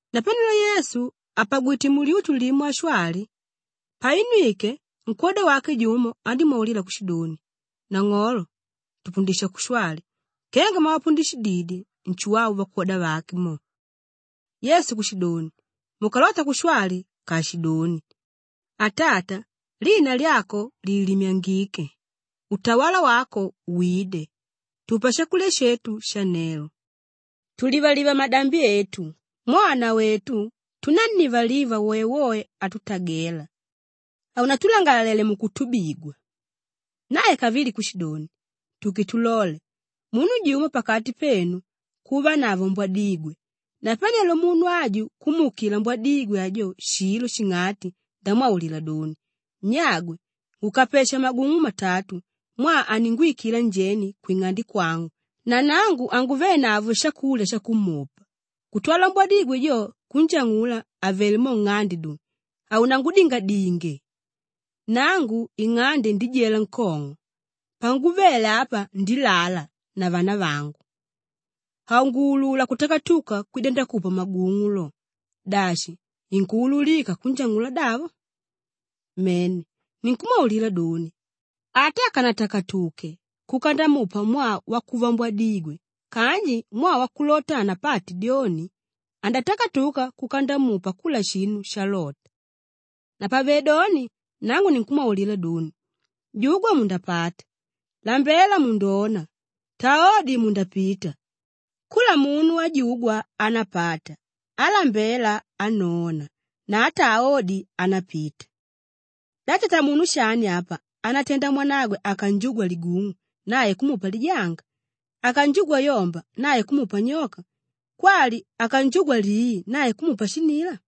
Napanelo Yesu àpagwite mulyutu limo ashwali; painwike, nkwóda wake jumo andímwaulila kushidoni, “Nang'olo, tupundisha kushwali kenga mwavapundishididye Nshuwau vakwoda vake mo.” Yesu kushidoni, “Mukalota kushwali, kaashidoni, “ ‘Atata, lina lyako liilimyangike. Utawala wako wide. Tupa shakulya shetu shanelo. Tulivaliva madambi etu mwaa nawetu tunánnivaliva woewoe átutagela. Haunatulangalalele mukutubigwa.’” Nae kavili kushidoni, “Tuke tulole, munu jumo pakati penu kuvanavo mbwadigwe; napanelo munu aju kumuukila mbwadigwe ajo shilo shing'ati ndamwaulila doni, ‘Nyagwe, ngukapesha magung'u matatu mwaa aninguwikila njeni kwing'ande kwangu na nangu hanguvenavo shakulya shakumupa,’ kutwala mbwadigwe jo kunjang'ula àvele mo nng'ande doni, ‘Haunangudingadinge. Nangu ing'ande ndijela nkong'o. Panguvele apa ndilala na vanavangu; hanguulula kutakatuka kwida ndakupa magung'u lo.’ Dashi inkuululika kunjang'ula davo? Mene, ninkumwaulila doni, ata akanatakatuke kuka ndamupa mwaa wakuva mbwadigwe kanji mwaa wakulota hanapate dyoni, andatakatuka kuka ndamupa kula shinu shalota. “Napavedoni nangu ninkumwaulila doni, “Jugwa mundapata, lambela mundona, taa odi mundapita; kula munu ájugwa anápata, álambela anóna na átaa odi, anápita. Da tatamunu shani apa, ánatenda mwanagwe akanjugwa ligung'u nae kumupa lijanga, akanjugwa yomba nae kumupa nyoka kwali akanjugwa lii nae kumupa shinila?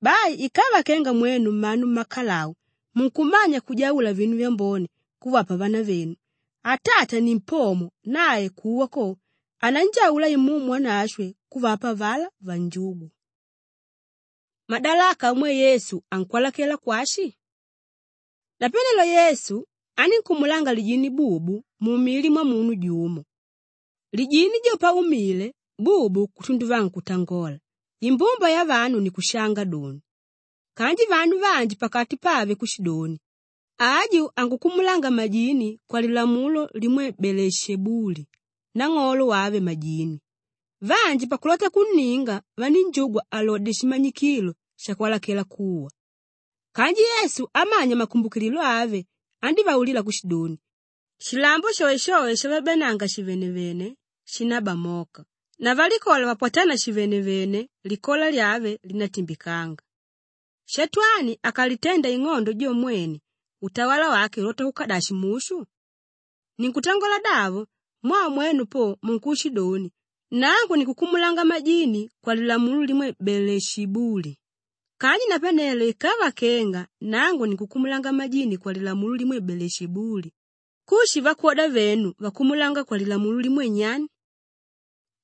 Bai ikava kenga mwenu mmanu mmakalau munkumanya kujaula vinu vyambone kuvapa vanavenu, Atata nimpomo nae kuwa ko, ananjaula Imumu Wanashwe kuvapa avalá vanjúgwa.” Madalaka amwe Yesu ankwalakela kwashi? Napanelo Yesu anínkumulanga lijini bubu mumili mwamunu jumo. Lijini jo paumile bubu kutunduvanga kutangola, imbumba yavanu ni kushanga doni. Kanji vanu vanji pakati pave kushidoni, “Aju ankukumulanga majini kwalilamulo limwe Beelishebuli nang'olo wave majini.” Vanji pakulota kunninga vanínjugwa alodye shimanyikilo shakwalakela kuwa. Kanji Yesu amanya makumbukililo ave, andívaulila kushidoni, “Shilambo shoeshoe shavabyaananga shivenevene, shinábamoka na valikola vapwatána shivenevene, likola lyave linátimbikanga. Shatwani akalitenda ing'ondo jo mwene, utawala wake ulota kuka dashi mushu? Ninkutangola davo mwaa mwenu po munkushidoni nangu ninkukumulanga majini kwalilamulo limwe Beelishebuli! Kanji napane ikava kenga nangu ninkukumulanga majini kwalilamulo limwe Beelishebuli, kushi vakwoda venu vankukumulanga kwalilamulo limwe nyani?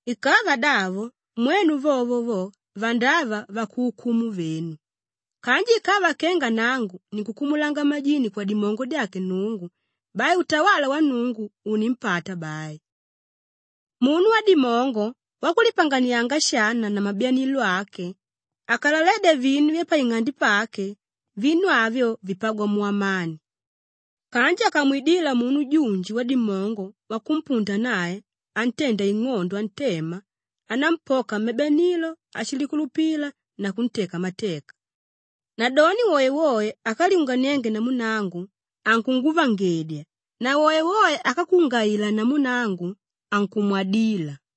Ikava davo mwenu vovo vo, vandava vakuukumu venu. Kanji ikava kenga nangu ninkukumulanga majini kwadimongo dyake Nnungu, bai utawala wa Nnungu unimpata bai. Munu wadimongo, wakulipanganianga shana na mabyanilo ake, akalaledya vinu vyapaing'ande pake; vinu avyo, vipagwa mu amani. Kanji akamwidila munu junji wadimongo wakumpunda nae antenda ing'ondo antema, anámpoka mabyanilo ashilikulupilila na kunteka mateka. Nadoni woewoe ákalyunganienge namu nangu, ankunguvangedya na woewoe ákakungaila namu nangu, ankumwadila.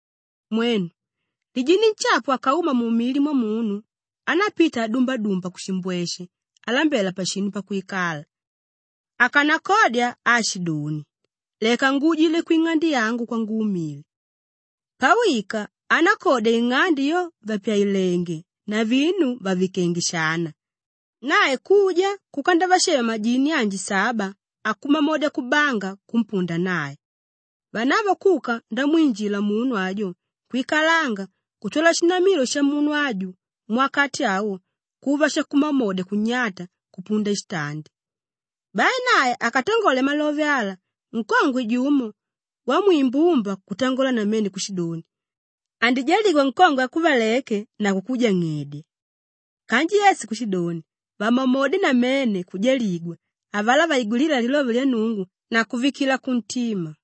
“Mwenu, lijini nshapu akauma mumili mwamunu, anápita adumbadumba kushimbweshe alambela pashinu pakwikala. Akanakodya aashidoni, ‘Leka nguujile kwing'ande yangu kwangumile.’ Pawika, anákodya ing'ande yo vàpyailenge na vinu vàvikenge shana; nae kuja kuka ndavashema majini anji saba akumamodya kubanga kumpunda nae. Vanavo kuka ndamwinjila munu ajo kwikalanga kutwala shinamilo shamunu aju muwakati awo, kuva shakumamodya kunyata kupunda shitandi.” Bai nae akatangole malove ala, nkongwe jumo wamwimbumba kutangola namene kushidoni, “Andijaligwa nkongwe ákuvaleke na kukujang'edya.” Kanji Yesu kushidoni, “Vamamodye namene kujaligwa avalá vaigwilíla lilove lya Nnungu na kuvikila kuntima.”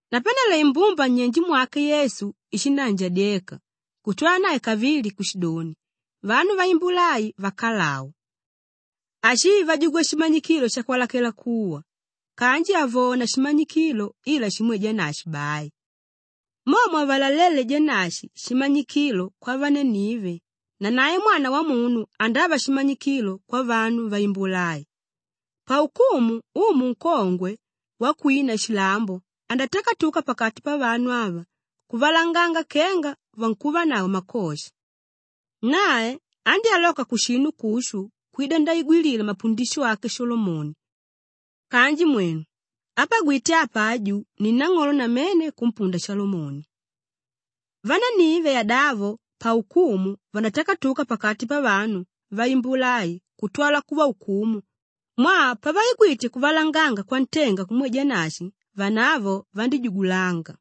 Napanelo imbumba nnyenje mwake Yesu ishindaanjadyeka kutwala nae kavili kushidoni, “Vanu vaimbula ai vakalau. Ashii vajugwa shimanyikilo shakwalakela kuwa! Kanji havona shimanyikilo ila shimwe Janashi bai. Mo mwavalalele Janashi shimanyikilo kwavanenive, nanae Mwana Wamunu andava shimanyikilo kwavanu vaimbula ai. Paukumu umu nkongwe wakwina shilambo andatakatuka pakati pavanu ava kuvavalanganga kenga vankuvanavo makosha. Nae andyáloka kushinu kushu kwida ndaigwilila mapundisho ake Shalomoni kanji mwenu, ápagwite apa aju ni nang'olo namene kumpunda Shalomoni. Vanenive yadavo paukumu vandatakatuka pakati pavanu vaimbula ai kutwala kuvaukumu mwaa pavaigwite kuvalanganga kwantenga kumwe Janashi vanavo vandíjugulanga.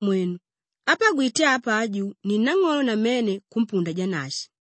Mwenu, ápagwite apa aju ni nang'olo namene kumpunda Janashi.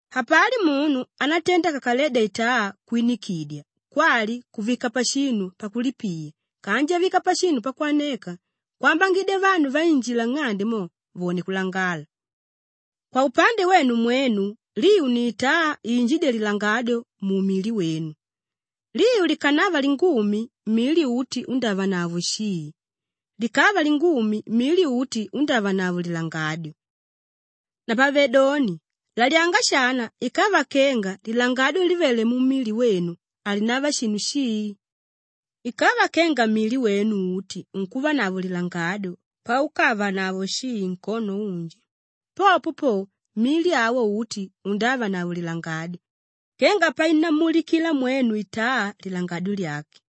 “Hapali munu ánatenda akakaledya itaa kwinikidya kwali kuvika pashinu pakulipiya kanji avika pashinu pakwaneka kwambangidya vanu vainjila nng'ande mo vone kulangala. Kwaupande wenu mwenu, liu ni itaa iinjídya lilangadyo mumili wenu. Liu likanava lingumi, mili uti undávanavo shii; likava lingumi, mili uti undávanavao lilangadyo. Napavedoni lalyanga shana ikava kenga lilangadyo livéle mumili wenu halinava shinu shii. Ikava kenga mili wenu uti unkuvanavo lilangadyo paukavanavo shii nkono unji, popo po mili awo uti undávanavo lilangadyo kenga painammulikila mwenu itaa lilangadyo lyake.”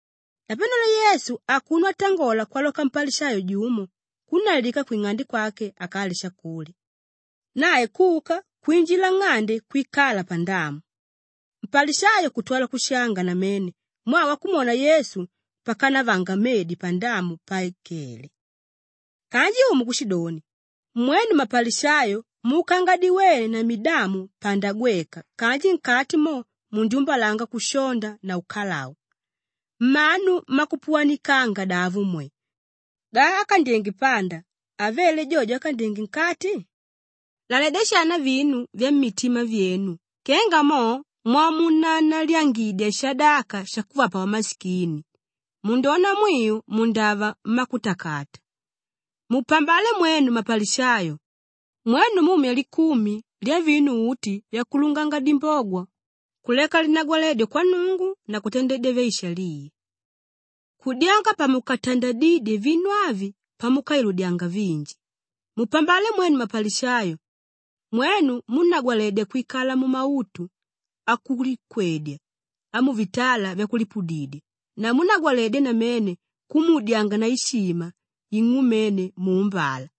Napanelo Yesu akuno atangola kwaloka mpalishayo jumo kunnalika kwing'ande kwake akalye shakulya. Nae kuka kwinjila nng'ande kwikala pandamu. Mpalishayo kutwala kushanga namene mwaa wakumwona Yesu pakanavanga medi pandamu paikéle. Kanji Umu kushidoni, “Mwenu mmapalishayo muukanga diwene na midamu panda gweka kanji nkati mo mundyumbalanga kushonda na ukalau. Mmanu mmakupuwanikanga davo mwe! Da ákandyenge panda havele jojo ákandyenge nkati? Laledya shana vinu vyammitima vyenu kenga mo mwamunanaliyangidya shadaka shakuvapa vamashikini, mundona mwiu mundava mmakutakata. “Mupambale mwenu mmapalishayo! Mwenu mumya likumi lyavinu uti vyakulunganga dimbogwa kuleka linagwaledyo kwa Nnungu na kutandedya vyaishaliya. Kudyanga pamukatandadidye vinu avi pamukailudyanga vinji. Mupambale mwenu mmapalishayo! Mwenu múnagwaledya kwikala mumautu akulikwedya amuvitala vyakulipudidya na múnagwaledya namene kumuudyanga na ishima ing'umene muumbala.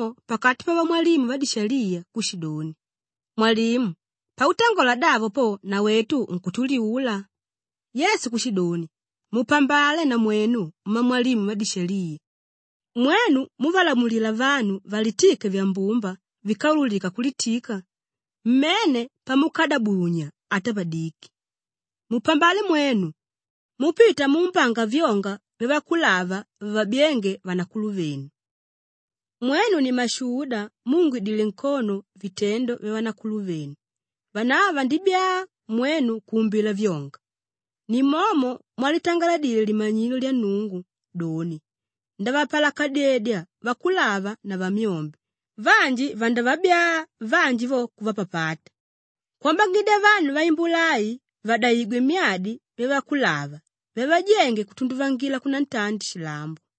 Kutwala mwalimu jumo pakati pavamwalimu vadishaliya kushidoni, “Mwalimu, pautangola davo po nawetu unkutuliula.” Yesu kushidoni, “Mupambale namwenu mmamwalimu vadishaliya! Mwenu múvalamulila vanu valitike vyambumba víkaululika kulitika, mmene pamukadabunya ata padiki. Mupambale mwenu! Múpita muumbanga vyonga vyavakulava vavabyénge vanakuluvenu. Mwenu ni mmashuda múungidile nkono vitendo vyavanakuluvenu; vanavo vandibyaa mwenu kuumbila vyonga. Nimomo mwalitangaladile Limanyilo lya Nnungu doni, ‘Ndavapalakadyedya vakulava na vamyombe, vanji vandavabyaa vanji vo kuvapapata,’ kwambangidya vanu vaimbula ai vadaigwe myadi vyavakulava vyavajénge kutunduvangila kunantandi shilambo.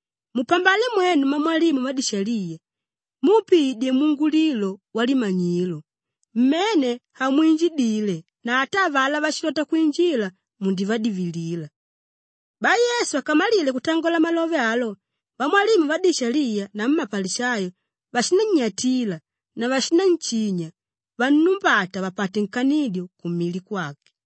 Mupambale mwenu mmamwalimu vadishaliya! Múpiidye mungulilo walimanyilo; mmene hamwinjidile na ata avalá váshilota kwinjila, mundivadivilila.” Bai Yesu akamalile kutangola malove alo, vamwalimu vadishaliya namu mapalishayo vashinannyatila na vashinanshinya vannumbata vapate nkanidyo kumili kwake.